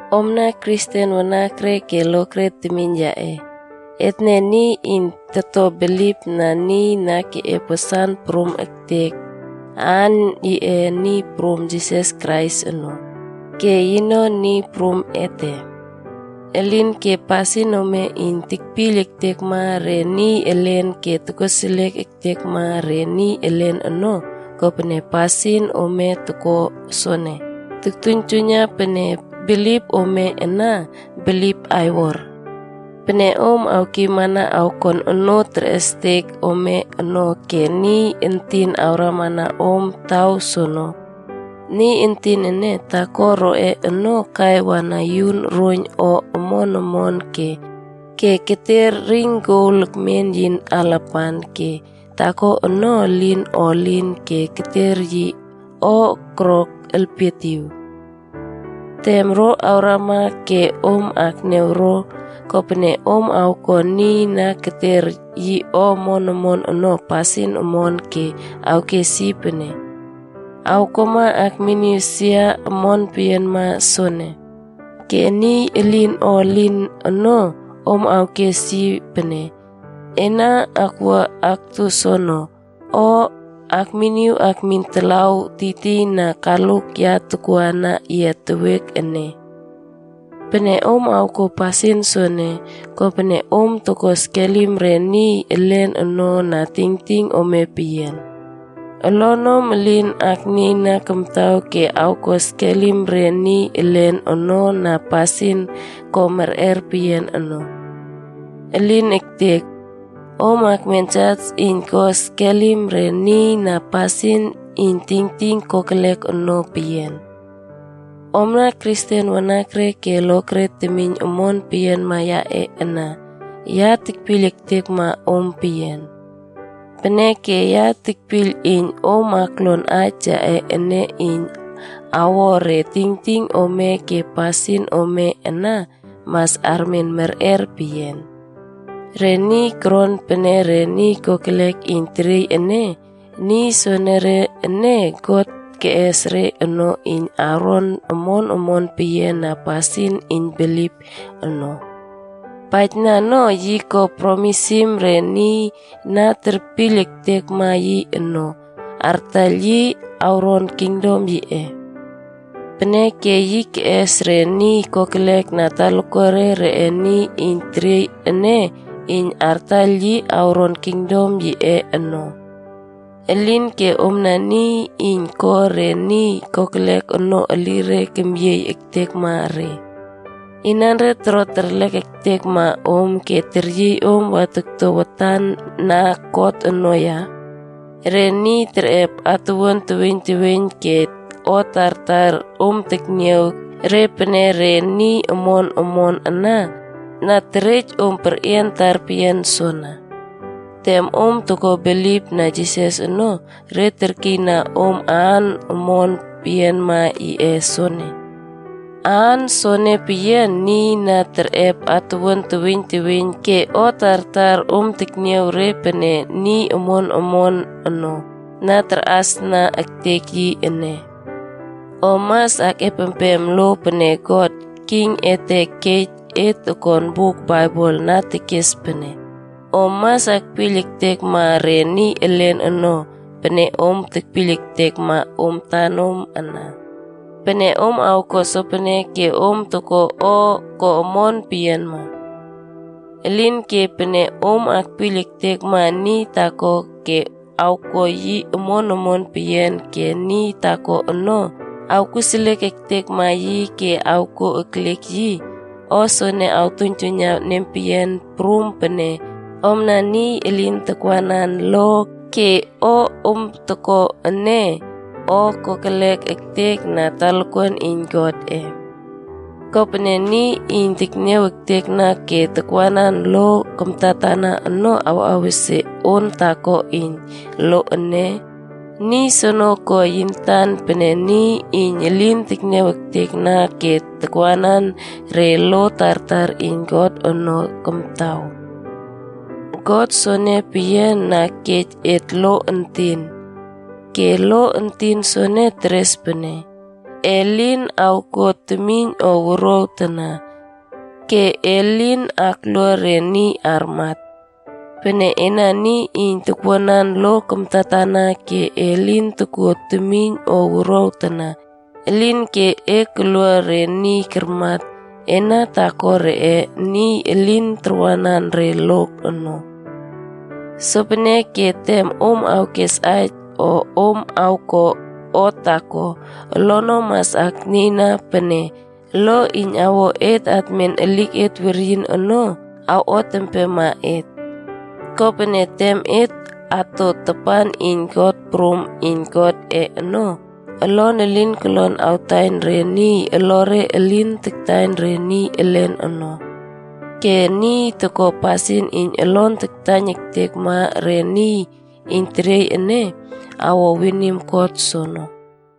Omna Kristen wanakre ke lokre temiyn yaꞌe, etne niy iyn toto bilipna niy na keꞌep wasan prum ektek, aan yiꞌe Niy Prum Jisas Krais ono, ke yino Niy Prum ete. Elinke pasin ome iyn tekpiyl ektekma re niy elen ke tokoseliek ektekma re niy elen ono, kopene pasin om toko soene, toktuiyntuiyna pene bilip ome ana, bilip aiwor. Pene om awkiymana awkon onoo terꞌestek ome ono ke niy entin awramana om taw soono. Niy entin ene, taako roꞌe ono kai wana yun roiyn o omon omon ke keter ring gol ekmen yi alapan, ke taako ono, elin o elin ke keter yi o koro elpietiw. Tem ro awrama ke om akniaw ro, kopene om awko niy na keter yi o omon omon ono pasin omon ke awkes yi pene, “Awkuama akmin sia omon peyianma soene.” Ke niy elin o elin ono, om awkes yi pene, “Ena wua aktu soono,” o “Ekminiw ekmin talaw tiytiyna kaluk ya tokuana yia tewiek ene.” Pene om awko pasin soene, kopene om toko skelim re niy elen ono na tingting ome peyian. Olonom elin nieyna kamtaw ke ko skelim re niy elen ono na pasin ko merꞌer peyian ono. Elin ektek. Om kemen jas iyn ko skelim re niy na pasin iyn tingting kokelek ono peyian. Omna Kristen wanakre ke lokre temiyn omon peyianma yaꞌe ana, ya tekpiyl ektekma om peyian. Peneke ya tekpiyl iyn om aklon aij yaꞌe ene iyn awo re tingting ome ke pasin ome ana mas armen merꞌer peyian. Re niy koron pene re niy kokelek iyn teriey ene, niy soenere ene, God keꞌes re ono iyn awron omon omon peyian na pasin iyn bilip ono. Paijna no, yi ko promisim re niy na terpiyl ektekma yi ono, artaiyl yi awron kingdom yiꞌe. Peneke yi keꞌes re niy kokelek na talakuare reꞌe niy iyn teriey ene iyn artaiyl yi awron kingdom yiꞌe ono. Elinke omna niy iyn ko re niy kokelek ono elire kemyiey ektekma re. Inanre toro terlek ektekma om ke teryiy om takwa tokto watan na kot ono ya? Re niy kerꞌep atuwuan teweiyn teweiyn ke o tartar om tekniaw re pene re niy omon omon ana, na terej om perꞌian tarpeyian soana. Tem om ko bilipna Jisas ono, re kerkiyna om aan omon peyianma yiꞌe soenea. Aan soene peyian, niy na kerꞌep atuwuan teweiyn teweiyn ke o tartar om tekniaw re pene niy omon omon ono, na tarꞌasna ektek yi ene. Om mas akꞌepempem lo pene God, King ete kej et okon buk Baibel na tekes pene, “Om mas akpiyl ektekma re niy elen ono, pene om tekpiyl ektekma om antanom ana.” Pene om awko sopene, ke om toko o ko omon peyianma. Elinke pene om akpiyl ektekma niy taako ke awko yi omon omon peyian ke niy taako ono awkoseliek ektekma yi ke awko eklek yi, o soene awtuiynjuiyna nempeyian prum pene omna niy elin takwanan lo ke o om toko ene, o kokelek ektek na talakuan iyn Godꞌe. Kopene niy iyn tekniaw ektekna ke takwanan lo kamtatana ono awꞌawesie on taako iyn lo ene, niy soono ko yi antan pene niy iyn elin tekniaw ektekna ke takwanan re lo tartar iyn Godꞌe ono kamtaw. God soene peyian na kej et lo entin. Ke lo entin soene teres pene, “E lin awko temiyn o wuruaw tana.” Ke “E lin aklua re niy armat.” Pene ena niy iyn takwuanan lo kamtatana ke e lin tokuo temiyn o wuruaw tana, elinke e kolua re niy karmat, ena taako reꞌe niy elin takwanan re lo ono. Sopeneke tem om awkes aij o om awko o taako, olonom mas aknieyna pene lo iyn awo et atmen eliket weryin ono, awot empema et. Kopene tem et ato tapan iyn kot prum iyn Godꞌe ono, olon elin kolon awtaiyn re niy olore elin kataiyn re niy elen ono. Ke niy toko pasin iyn olon taktaiyn ektekma re niy iyn teriey ene, awo winim kot soono.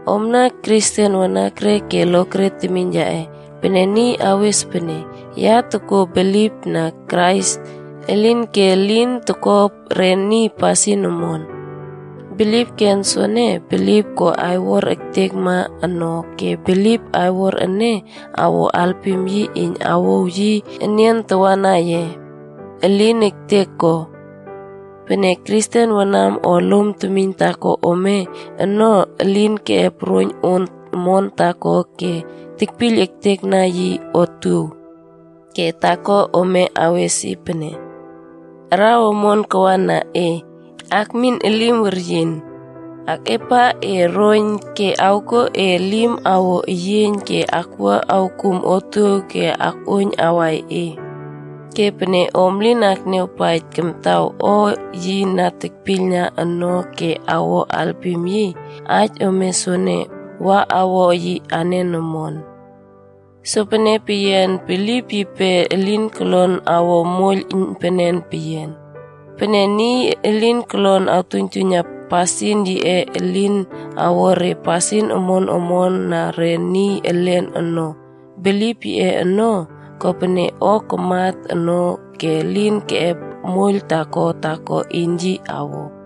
Omna Kristen wanakre ke lokre temiyn yaꞌe, pene niy awes pene, “Ya tokuo bilipna Krais,” elinke elin toko re niy pasin omon. Bilip ken soene, bilip ko aiwor ektekma ono ke bilip aiwor ene awo alpim yi iyn awouw yi enian tawana ye? Elin ektek ko! Pene Kristen wanam o lom temiyn taako ome ono, elin keꞌep roiyn on omon taako ke tekpiyl ektekna yi otuow. Ke taako ome awes yi pene, “Araw omon kawana e ke akmin elim weryin. Akꞌuap e roiyn ke awkuo e elim awo eyieiyn ke wua awkuw otuow ke akꞌuoiyn awai e.” Ke pene om lin akniaw akpaijna kamtaw o yi na tekpiylna ono ke awko alpim yi, aij ome soene wa awo yi anen omon? Sopene peyian, bilip yipe elin kolon awo moiyl iynpenen peyian. Pene niy elin kolon awtuiynjuiyna pasin yiꞌe iyn awo re pasin omon omon na re niy elen ono, bilip yiꞌe ono, kopene o kamat ono ke elin keꞌep moiyl taako taako iyn yi awo.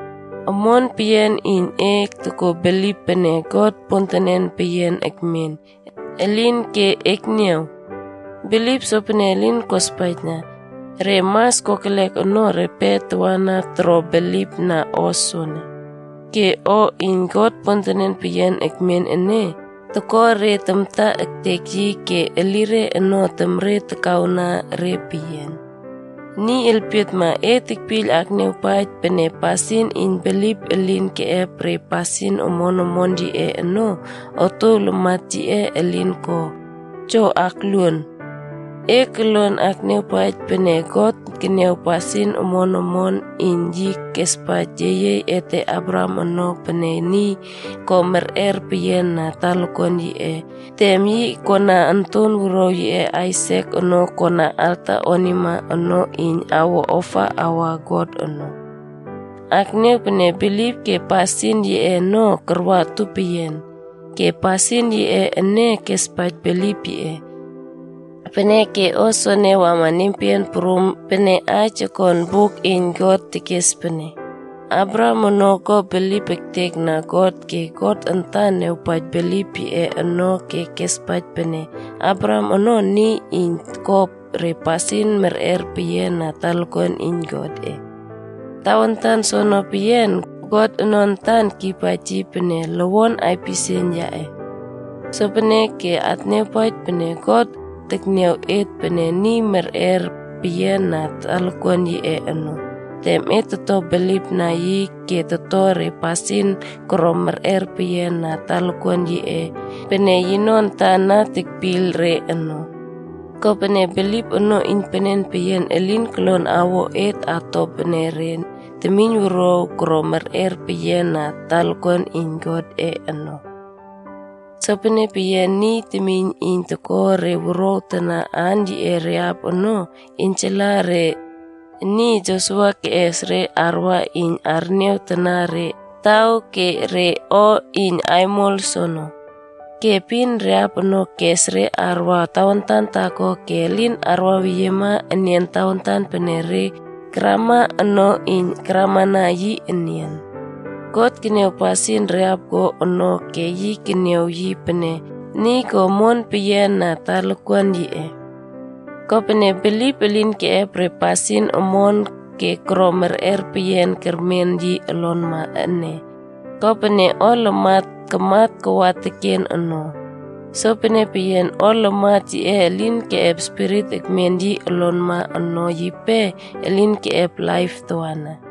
Omon peyian iyn e tokuo bilip pene God pontenen peyian ekmen. Elinke, ekniaw! Bilip sopene elin kospaijna. Re mas kokelek ono repe tawana toro bilipna o soene. Ke o iyn God pontenen peyian ekmen ene, toko re tamta ektek yi ke elire ono na temre takawna re peyian. Niy elpietma, e tekpiyl akniawpaij pene pasin iyn bilip elin keꞌep re pasin omon omon yiꞌe ono, otuow lamat yiꞌe elin ko? Jo, akluon. E koluon akniawpaij pene God keniaw pasin omon ke yi espaij yeyiey ete Abraham ono pene niy ko merꞌer peyiana talakuan yiꞌe tem yi koꞌana onton wuruaw yiꞌe Aisak ono kon alta onima ono iyn awo ofa awa God ono. Akniaw pene bilip ke pasin yiꞌe ono karwa utupeyian. Ke pasin yiꞌe ene kespaij bilip yiꞌe. Peneke o soene wama nempeyian prum pene aij okon buk iyn Godꞌe tekes pene, “Abraham ono ko bilip ektekna God ke God antan niawpaij bilip yiꞌe ono ke kespaij pene Abraham ono niy iyn toko re pasin merꞌer peyian na talakuan iyn Godꞌe.” Tawantan soene peyian, God ono antan kiypaij yi pene, “lowon aipisieiyn yaꞌe.b” Sopeneke akniawpaij pene, God tekniaw et pene niy merꞌer peyian na talakuan yiꞌe ono, tem et toto bilipna yi ke toto re pasin koro merꞌer peyian na talakuan yiꞌe pene yino antan na tekpiyl re ono. Kopene bilip ono iynpenen peyian elin kolon awo et ato pene re temiynwuruaw koro merꞌer peyian na talakuan iyn Godꞌe ono. Sopene peyian, niy temiyn iyn toko wuruaw tana aan yiꞌe Rahap ono, iynjala re niy Josua kes re karwa iyn arniaw tana re taw ke re o iyn aimol soono. Ke epin, Rahap ono kes re karwa tawantan taako ke elin karwaweyie enian tawantan pene re karama ono iyn karamana yi enian. God keniaw pasin Rahap ko ono ke yi keniaw yi pene niy ko omon peyian na talakuan yiꞌe. Kopene, bilip elin keꞌep re pasin omon ke koro merꞌer peyian kermen yi olonma ene, ko pene o lamat kamat kawa teken no. Sopene peyian, o lamat yiꞌe elin keꞌep spirit ekmen yi olonma ono yipe elin keꞌep laip tawana.